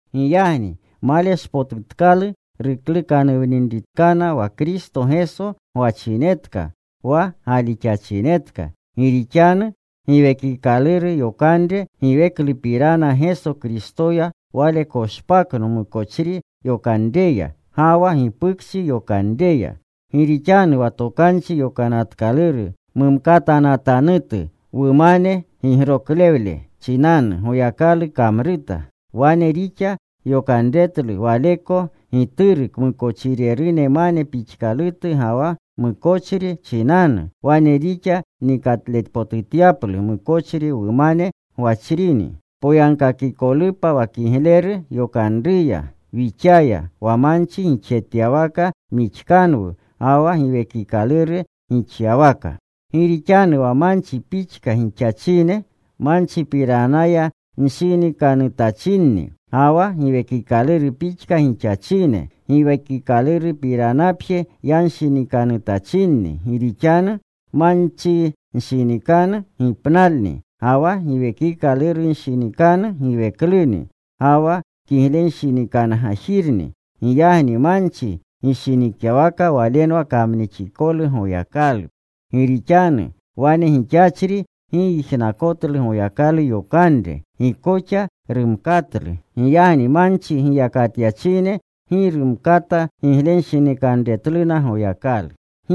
Giyagni maleshpotutkalu ruklukanuwninritkana wa Kristo Geso gwachinetka, wa galixachinetka. Gi rixanu Giwekikaluru yokanre giweklupirana Geso Kristoya wale koshpakno mukochri yokanreya, ga wa gipukchi yokanreya. Gi rixanu wa Tokanchi Yokanatkaluru mumkatanatanutu, wumane gigroklewle chinanu, Goyakalu kamruta. Wane rixa yokanretlu Waleko Gituru kmukochirerunmane pixkalutu ga wa mukochri chinanu. Wane rixa nikatlepotutyaplu mukochri wumane gwachrini, poyagkakikolupa wa kigleru yokanruya wixaya, wa manchi gixjetyawaka mixkanwu, ga wa Giwekikaluru gixyawaka. Gi rixanu manchi pixka gixachine, manchipiranaya nshinikanutachinni; ga wa Giwekikaluru pixka gixachine, Giwekikalurupiranapje yanshinikanutachinni. Gi rixanu manchinshinikanu gipnalni, ga wa Giwekikalurunshinikanu giwekluni, ga wa kiglenshinikangajirni. Giyagni manchi gishinikyawaka walenwa kamnixikolu Goyakalu. Gi rixanu wane gixachri gi yijnakotlu Goyakalu yokanre. Gi koxa rumkatlu. Giyagni manchi giyakatyachine gi rumkata giglenshinikanretluna Goyakalu.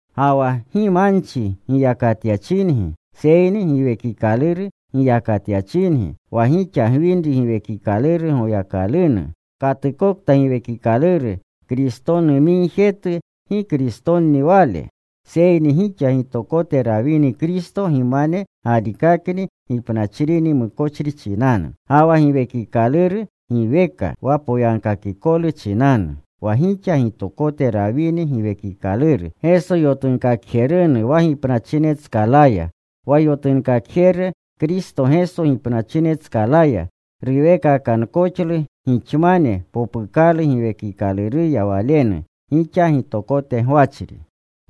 Ga wa gi manchi giyakatyachingi, seyni Giwekikaluru giyakatyachingi, wa gixa gwinri Giwekikaluru Goyakalunu. Katukta Giwekikaluru Kristonumigjetu, gi Kristonni wale. Seyni gixa gitokote rawini Kristo, gimane galikakni gipnachrini mukochri chinanu. Ga wa giwekikaluru giweka wa poyagkakikolu chinanu. Wa gixa gitokote rawini Giwekikaluru, Geso yotunkakjerunu wa gipnachinetskalaya, wa yotunkakjeru Kristo Geso gipnachinetskalaya ruweekakankoxlu gixamane popukalu Giwekikaluruya Walenu, gixa gitokote gwachri.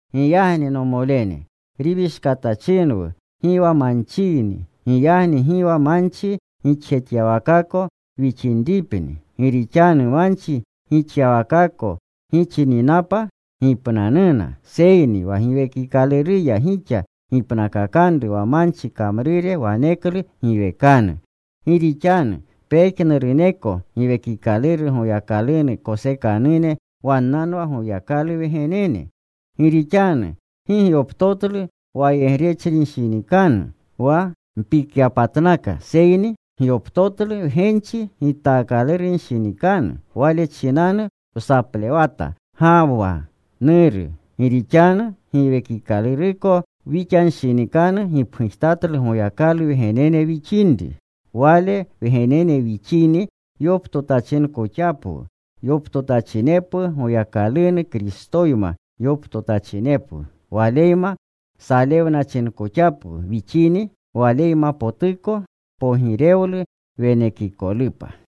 Giyagni nomolene, riwishkatachinwu, gi wa manchiyni, giyagni gi wa manchi gixjetyawakako wixinripni. Gi rixanu manchi gixyawakako gixininapa, gipnanuna. Seyni wa Giwekikaluruya gixa gipnakakanru wa manchi kamrure waneklu giwekanu. Gi rixanu pejnuruneko Giwekikaluru Goyakalunu kosekanune, wannanwa Goyakalu wgenene. Gi rixanu gi gyoptotlu wayegrechinshinikanu wa mpikyapatnaka. Seyni gyoptotlu wgenchi gitaakalurunshinikanu. Wale chinanu wsaplewata, “Gawwa, Nuru.” Gi rixanu Giwekikaluruko wixanshinikanu gipgujtatlu Goyakalu wgenene wixinri. Wale wgenene wixini, yoptotachinkoxapwu; yoptotachinepwu Goyakalunu; Kristoyma yoptotachinepwu. Waleyma salewnachinkoxapwu wixini, Waleymapotuko pogirewlu wenekikolupa.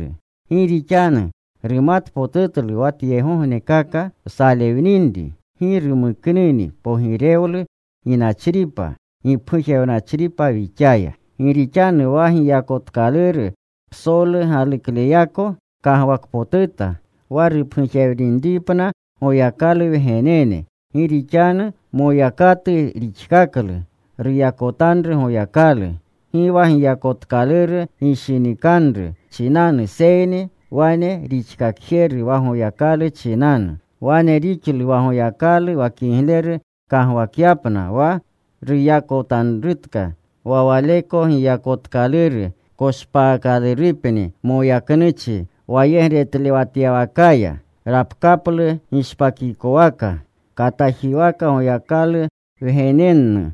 Gi rixanu numatpotutlu wa tyegognekaka wsalewninri gi rumuknini pogirewlu ginachripa gipgujewnachripa wixaya. Gi rixanu wa giyakotkaluru psolu galukleyako kagwakpotuta wa rupgujewninripna Goyakalu wgenene. Gi rixanu moyakatu rixkaklu ruyakotanru Goyakalu, gi wa giyakotkaluru gishinikanru chinanu, seyni wane rixkakjeru wa Goyakalu chinanu. Wane rixlu wa Goyakalu wa kigleru kagwakyapna wa ruyakotanrutka. Wa waleko giyakotkaluru koshpaakalurupni moyaknuchi wayegretlewatyawakaya. Rapkaplu gishpakikowaka katajiwaka Goyakalu wgenennu.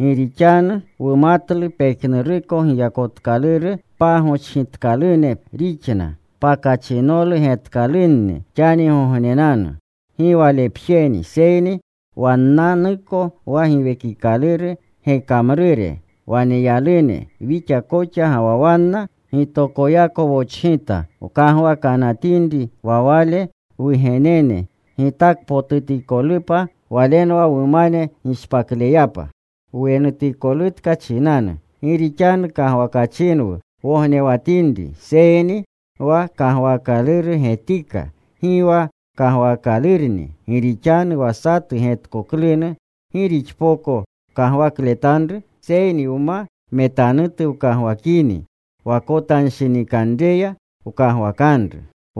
Gi rixanu wumatlu pejnuruko giyakotkaluru pagochgitkalune rixna, pakachinolu getkalunni xanigognenanu. Gi walepjeni, seyni wannanuko, wa Giwekikaluru gekamrure waneyalune, wixa koxa ga wa wanna gitokoyako wochgita, wkagwakanatinri wa Wale wugenene gitakpotutikolupa, walenwa wumane gishpakleyapa, wenutikolutka chinanu. Gi rixanu kagwakachinwu wognewatinri. Seyni wa kagwaakaluru getika, gi wa kagwaakalurni. Gi rixanu wa satu getkoklunu, ¿gi rixpoko kagwakletanru? Seyni wma metanutu wkagwakini, wakotanshinikanreya wkagwakanru.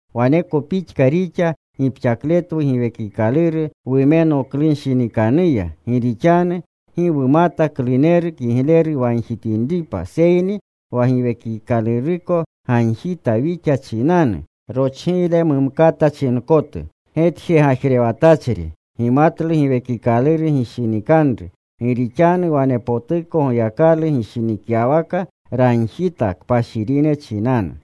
Waneko pixka rixa gipxakletwu Giwekikaluru wumenoklunshinikanruya. Gi rixanu gi wumata kluneru kigleru wagjitinripa. Seyni wa Giwekikaluruko gagjita wixa chinanu rochgiyle mumkata chinkotu. Getjegajrewatachri gimatlu Giwekikaluru gishinikanru. Gi rixanu wanepotuko Goyakalu gishinikyawaka, ragjita kpashirine chinanu.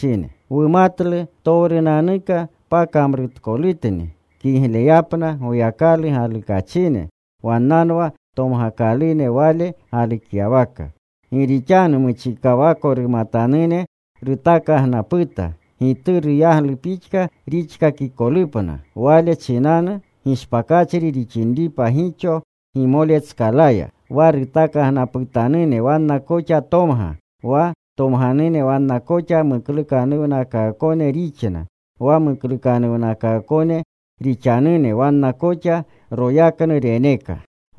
Wumatlu ptowrunanuka pakamrutkolutni kigleyapna Goyakalu galukachine, wannanwa tomgakalune Wale galukyawaka. Gi rixanu muchikawako rumatanune rutakagnaputa, Gituru yaglu pixka rixkakikolupna, Wale muchinanu gishpakachri rixinripa gixo gimolenetskalaya. Wa rutakagnaputanune wanna koxa tomga. Wa tomganune wanna koxa muklukanuwnakaakone rixna. Wa muklukanuwnakaakone rixanune wanna koxa royaknu reneka.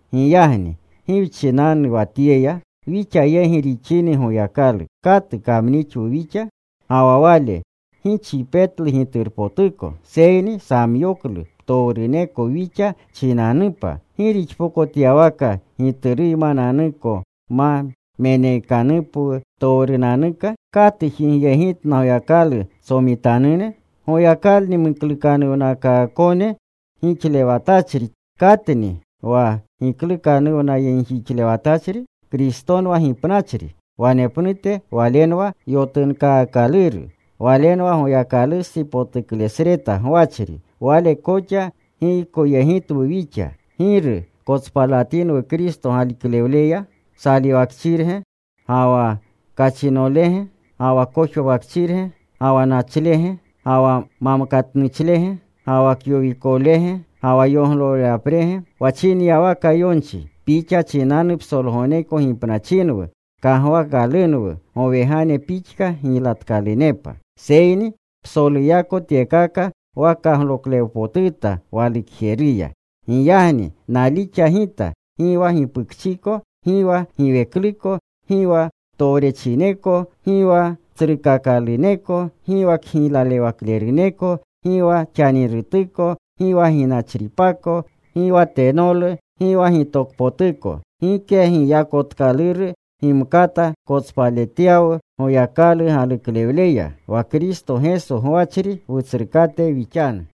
Giyagni ¿gi wchinanu wa tyeya? Wixa yegi rixini Goyakalu, ¿katu kamnixwu wixa? Ga wa Wale gi chipetlu Giturpotuko, seyni samyoklu ptowruneko wixa chinanupa ¿gi rixpokotyawaka Gituruymananuko ma meneekanupwu ptowrunanuka? ¿Katu jigyegitna Goyakalu tsomitanune? Goyakalni muklukanuwnakaakone gixkaklewatachri ¿Katni wa giklukanuwnayegjixlewatachri? Kristonwa gipnachri. Wanepnute Walenwa yotunkaakaluru. Walenwa Goyakalustsi potuklesreta gwachri. Wale koxa giykoyegitwu wixa. ¿Giru kotspalatinwu Kristo galuklewleya? ¿salewakchirge? ¿ga wa kachinolege? ¿ga wa kojwawakchirge? ¿ga wa nachlege? ¿ga wa mamkatutnuchlege? ¿ga wa kyowikolege? ¿ga wa yoglolewaprege? Wa chinyawaka yonchi: Pixa chinanu psolgogneko gipnachinwu. Kagwaakalunwu gowegane pixka giylatkalunepa. Seyni psoluyako tyekakaya wakagloklewpotuta walukjeruya. Giyagni nalixa gita, gi wa gipukchiko, gi wa giwekluko, gi wa kamchineko, gi wa tsrukakaluneko, gi wa kgiyaklewakleruneko, gi wa xanirutuko, gi wa ginachripako, gi wa tenolu, gi wa gitokpotuko, gike giyakotkaluru gimkata kotspaletyawu Goyakalu galuklewleya, wa Kristo Geso gwachri, Wutsrukate wixanu.